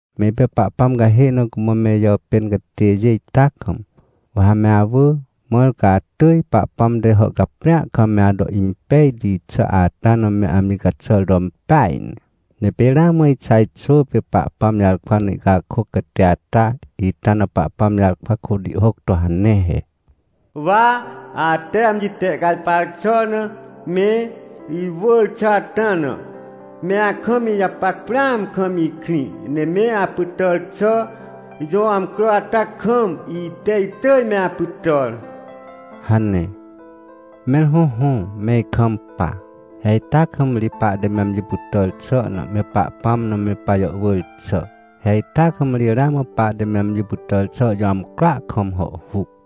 Me ipê Pahpãm cahê na cumã me ijàpên catêjê ita kam, wa ha me awỳ, mãr ca atỳj Pahpãm te hàhcaprĩa kam me ato impejti xà ata na me amji caxàr to impeaj ne. Ne pê ramã Ixaj xwỳ pê Pahpãm jarkwa na ihcakôc catê ata, ita na Pahpãm jarkwa kôt ihhôc to hane he: “Wa, ate amji tehcajpar xà na me iwỳr xà ata na, me akam ijapac prãam kam ikrĩ. Ne me apytàr xà jõ amcro ata kam, ite itỳj me apytàr” hane. Mẽr hõhõ, me ikampa. He ita kam ri pahte me amji pytàr xà na, me Pahpãm na me pajàhwỳr xà. He ita kam ri ramã pahte me amji pytàr xà jõ amcroa kam hàhhuc.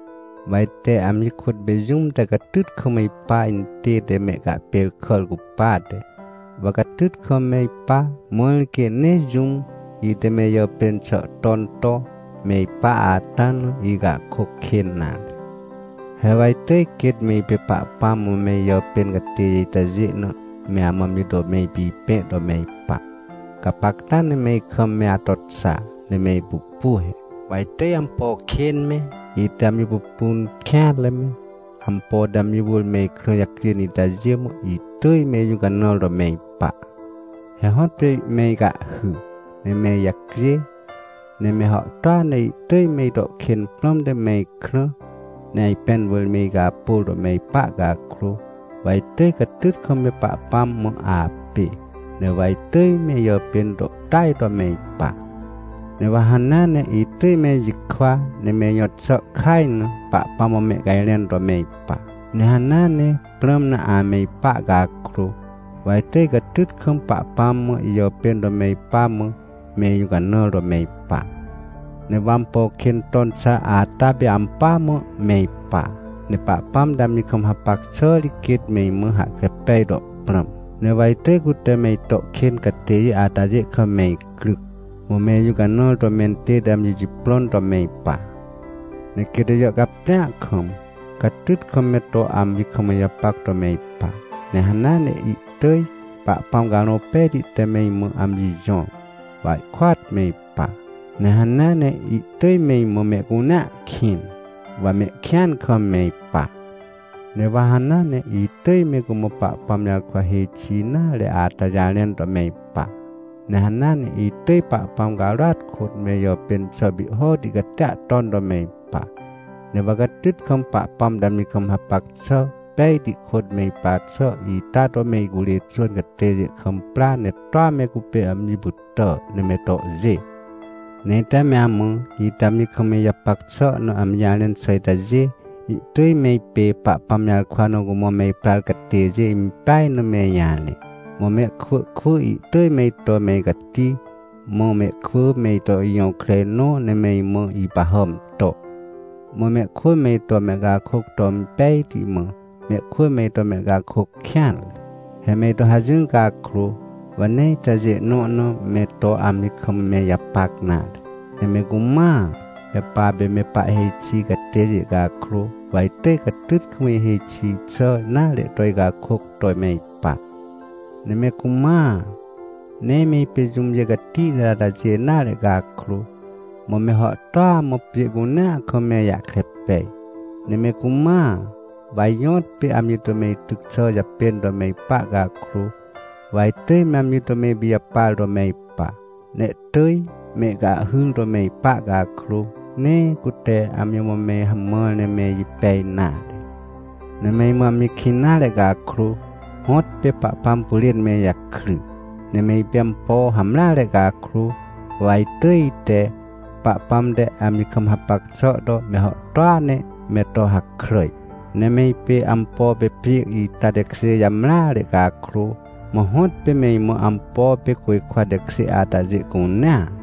Wa ite amji kôt me jũm te catyt kam ipa intête mehcahpêrkàr cupate, wa catyt kam me ipa, mãr quê nee jũm, ite me ijàpên xà ton to me ipa ata na, ihcakôc kên nare. He wa itỳj quêt me ipê Pahpãm mã me ijàpên catêjê itajê na me amã amji to me ipipẽ to me ipa. Gapacta ne me ikam me ato xa ne me ipupu he: Wa itỳj ampo kên me, ite amji pupun kêanre me, ampo te amji wỳr me ikrã jacjên itajê mã, itỳj me ijũcanãr to me ipa. He hõtpê me icahhy, ne me ijacjê, ne me hàhtôa ne ihtỳj me ito kên prãmte me ikrã, ne ajpẽn wỳr me icapôr to me ipa cakrô, wa itỳj catyt kam me Pahpãm mã apê. Ne wa itỳj me ijapên to tỳaj to me ipa. Ne wa hanea ne itỳj me ijikwa ne me ijõt xà kaj na, Pahpãm mã mehcajrẽn to me ipa. Ne hanea ne prãm na ame ipa cakrô, wa itỳj catyt kam Pahpãm mã ijàpên to me ipa mã, me ijũcanãr to me ipa. Ne wa ampo kên ton xà ata pê ampỳa mã me ipa, ne Pahpãm te amji kam hapac xà ri quêt me imã hahkre pej to prãm. Ne wa itỳj cute me ito kên catêjê atajê kam me icryc, mã me ijũcanãr to mentête amji jiprõn to me ipa. Ne quêt ijàhcaprĩa kam, catyt kam me to amji kam ijapac to me ipa. Ne hanea ne ihtỳj Pahpãm Carõ Pejti te me imã amji jõr, wa ihkôat me ipa. Ne hanea ne ihtỳj me imã mehcunea kĩn, wa mehkĩan kam me ipa. Ne wa hanea ne itỳj me cumã Pahpãm jarkwa hêj xi nare ata jarẽn to me ipa. Ne hanea ne itỳj Pahpãm carôat kôt, me ijàpên xà pihhoti catia ton to me ipa. Ne wa catyt kam Pahpãm te amji kam hapac xà pejti kôt me ipa xà ita to me icurê xwỳn catêjê kam pra ne toa me cupê amji pytà, ne me tohjê. Ne ite me amã, ite amji kam me ijapac xà na amji jarẽn xà itajê, ihtỳj me ipê Pahpãm jarkwa na cumã me iprar catêjê impeaj na me ijarẽ. Mã mehkwỳ kwỳ ihtỳj me ito me icati, mã mehkwỳ me ito ijõkrenõ, ne me imã ipahàm to. Mã mehkwỳ me ito mehcakôc to impejti, mã mehkwỳ me ito mehcakôc kêanre. He me ito hajỹr cakrô, wa nee itajê nõ na me to amji kam me ijapac nare. Ne me cumãa, me papê me pahhêj xi catêjê cakrô, wa itỳj catyt kam ihêj xi xà nare to icakôc to me ipa. Ne me cumãa, nee me ipê jũmjê catihti atajê nare cakrô, mã me hàhtôa mã pjê cunea kam me ijahkre pej. Ne me cumãa, wa ijõtpê amji to me ityc xà japên to me ipa cakrô, wa itỳj me amji to me ipijapar to me ipa. Ne ihtỳj me icahhyr to me ipa cakrô, nee cute amji mã me hamãr ne me ijipej nare. Ne me imã amji kĩn nare cakrô, hõtpê Pahpãm pyrên me ijakry. Ne me ipê ampo hamreare cakrô, wa itỳj ite, Pahpãm te amji kam hapac xà to, me hàhtôa ne me to hakràj. Ne me ipê ampo pê pjê ita tekjê jamreare cakrô, mã hõtpê me imã ampo pê côjkwa tekjê atajê cunea.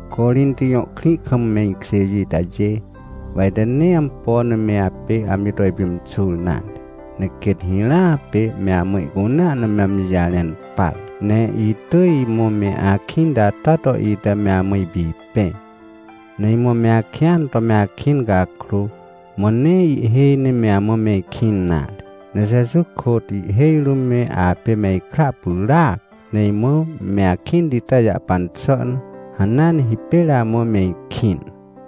Corinti jõ krĩ kam me ikjêjê itajê, wa ite nee ampo na me apê amji to ipimxur nare, ne quêt hirãa pê me amã ihcunea na me amji jarẽn par. Ne itỳj imã me akĩnti ata to ite me amã ipipẽ. Ne imã me akĩan to me akĩn cakrô, mã nee ihhêj ne me amã me ikĩn nare. Ne Jeju kôt ihhêj rũm me apê me ikra pyràac. Ne imã me akĩnti ita jahpan xà na, hanea ne hipêr amã me ikĩn.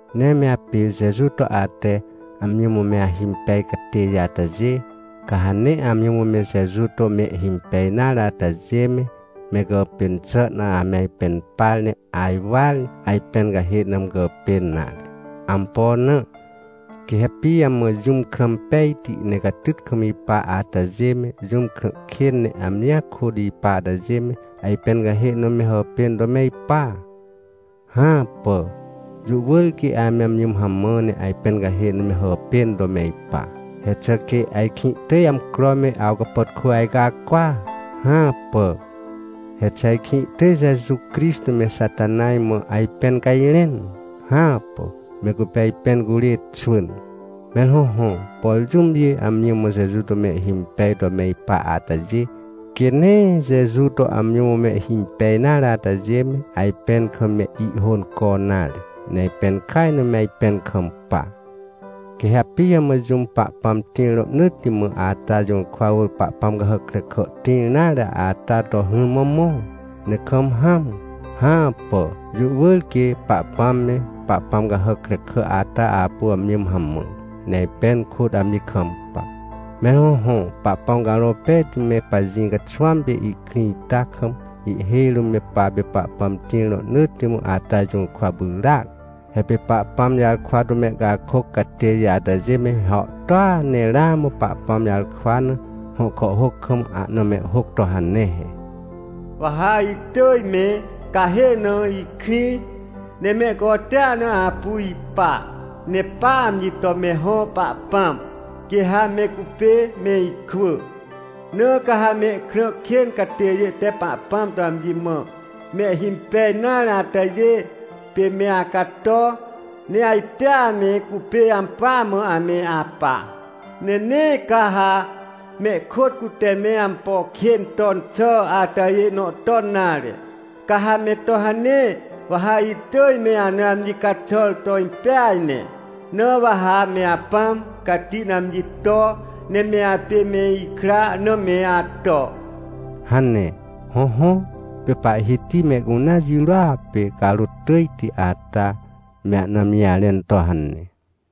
Ne me apê Jeju to ate amji mã me ahimpej catêjê atajê, ca ha nee amji mã me Jeju to mehhimpej nare atajê me, me gàpên xà na ame ajpẽn par, ne ajwar, ajpẽn cahê na me gàpên nare. Ampo na? Quê ha pijamã jũm krã impejti ne catyt kam ipa atajê me, jũm krã kên ne amjia kôt ipa atajê me, ajpẽn cahê na me hàpên to me ipa? Hãpà! Jũ wỳr quê ame amji mã hamã ne ajpẽn cahê na me hàpên to me ipa. He xà quê ajkĩ ihtỳj amcro me awcapàtkô ajcacwa? Hãpà! He xà ajkĩ ihtỳj Jeju Crixtô me Xatanaj mã ajpẽn cajrẽn? Hãpà! Me cupê ajpẽn curê xwỳn. Mẽr hõhõ, por jũmjê amji mã Jeju to mehhimpej to me ipa atajê, quê nee Jeju to amji mã mehhimpej nare atajê me, ajpẽn kam me ihhônco nare, ne ajpẽn kaj na me ajpẽn kampa. Quê ha pijamã jũm Pahpãm tĩr rohnỳtti mã ata jũrkwa wỳr pahpãm cahàc krekà tĩr nare ata to hỹrmã mõ, ne kam hãm? Hãpà! Jũ wỳr quê Pahpãm me, pahpãm cahàc krekà ata apu amji mã hamã, ne ajpẽn kôt amji kampa. Mẽr hõhõ, Pahpãm Carõ Pejti me pajĩ caxwãm pê ihkrĩ ita kam, ihhêj rũm me papê Pahpãm tĩr rohnỳtti mã ata jũrkwa pyràac. He pê Pahpãm jarkwa to mehcakôc catêjê atajê me hàhtôa, ne ramã Pahpãm jarkwa na, hõ kàhhôc kam, ahna mehhôc to hane he: “Wa ha itỳj me cahê na ikrĩ, ne mehcotea na apu ipa, ne pa amji to me hõ Pahpãm, quê ha me cupê me ikwỳ. Na ca ha mehkrã kên catêjê te Pahpãm to amji mã mehhimpej nare atajê pê me acato, ne ajtea me cupê ampỳa mã ame apa. Ne nee ca ha mehkôt cute me ampo kên ton xà atajê nõ ton nare. Ca ha me to hane, wa ha itỳj me ana amji caxàr to impeaj ne. Na wa ha me Apãm Cati na amji to, ne me apê me ikra na me ato” hane. Hõhõ, pê Pahhiti mehcunea jirôa pê carôt tỳjti ata, me ana amji jarẽn to hane.